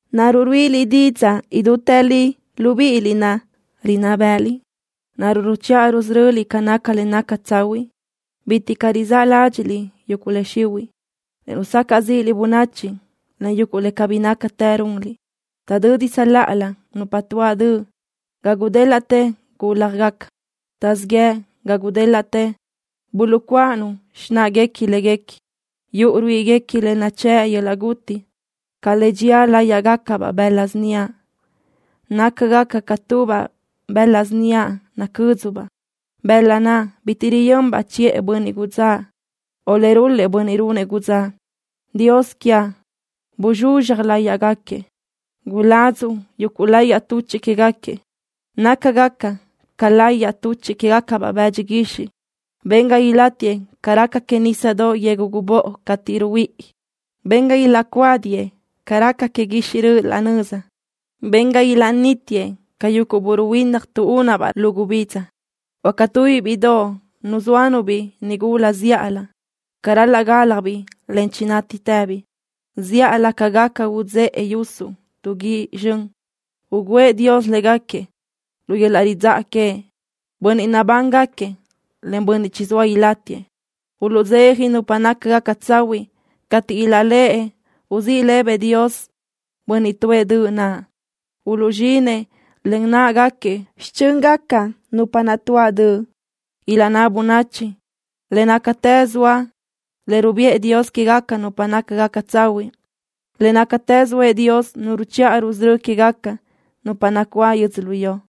¿Naruʼ ruíʼiliʼ didzaʼ idútë li, libíʼiliʼ naʼ, rinná bë́ʼëliʼ? ¿Naruʼ ruchiʼa rusöröliʼ ca naca le naca tsahuiʼ? ¡Bitiʼ caʼ! Rizáʼ ládxiʼliʼ yuguʼ le xihuiʼ, en rusacaʼ zíʼiliʼ bönachi len yuguʼ le cabí nácatë runliʼ. Taʼdödi tsöláʼalö nupa tuáʼ döʼ ga gudélaʼtë gúljagaca. Taʼzíʼ yëʼ ga gudélaʼtë buluʼcuáʼanu xináʼaguequi léguequi. Yuʼu ruíʼiguequi le nachë́ʼ yöl-laʼ guti ca le dxía láyiʼgacabaʼ bëla síniaʼ. Nácagaca ca tubaʼ bëla síniaʼ nacö́dzubaʼ, bëla naʼ bitiʼ riyönbaʼ chiʼë bönniʼ gudzáʼ, o le rul-lëʼ bönniʼ runëʼ gudzáʼ. ¡Dios quiaʼ! ¡Buzxuzxaj láyiʼgaquiëʼ! ¡Guladzuʼ yuguʼ layiʼ tuchiʼ quégaquiëʼ nácagaca ca layiʼ tuchiʼ quégacabaʼ bëdxi guixiʼ! ¡Ben ga ilaʼnítiëʼ ca raca que nisa yegu gubóʼo cateʼ ruhuíʼi! ¡Ben ga ilaʼcuádiëʼ ca raca que guixiʼ röʼö laʼ nöza! ¡Ben ga ilaʼnítiëʼ ca yuguʼ bö́ruhuinna tuʼúnabaʼ lu gubidza, o ca tubiʼ bíʼidoʼ nuzóanu-biʼ nigula zíʼalö ca ral-laʼ gáljabiʼ, en chinátitëbiʼ! Zíʼalö ca gaca utsëʼe yusuʼ tu guíʼ zxön, ugǘëʼ Dios légaquiëʼ lu yöl-laʼ ridzáʼa queëʼ, bönniʼ nabángaquiëʼ, en bönniʼ chizóa ilátiëʼ. Uluʼdzeja nupa nácagaca tsahuiʼ cateʼ ilaʼléʼe uzíʼ lëbëʼ Dios bönniʼ tuʼë döʼ naʼ. Uluʼzxinëʼ len náʼagaquiëʼ xichö́ngaca nupa naʼ tuáʼ döʼ. Ilaʼnná bönachi: “Le nácatë zoa le rubiʼë Dios quégaca nupa nácagaca tsahuiʼ. Le nácatë zoëʼ Dios Nu ruchiʼa rusörö́ quégaca nupa nacuáʼ yödzölió.”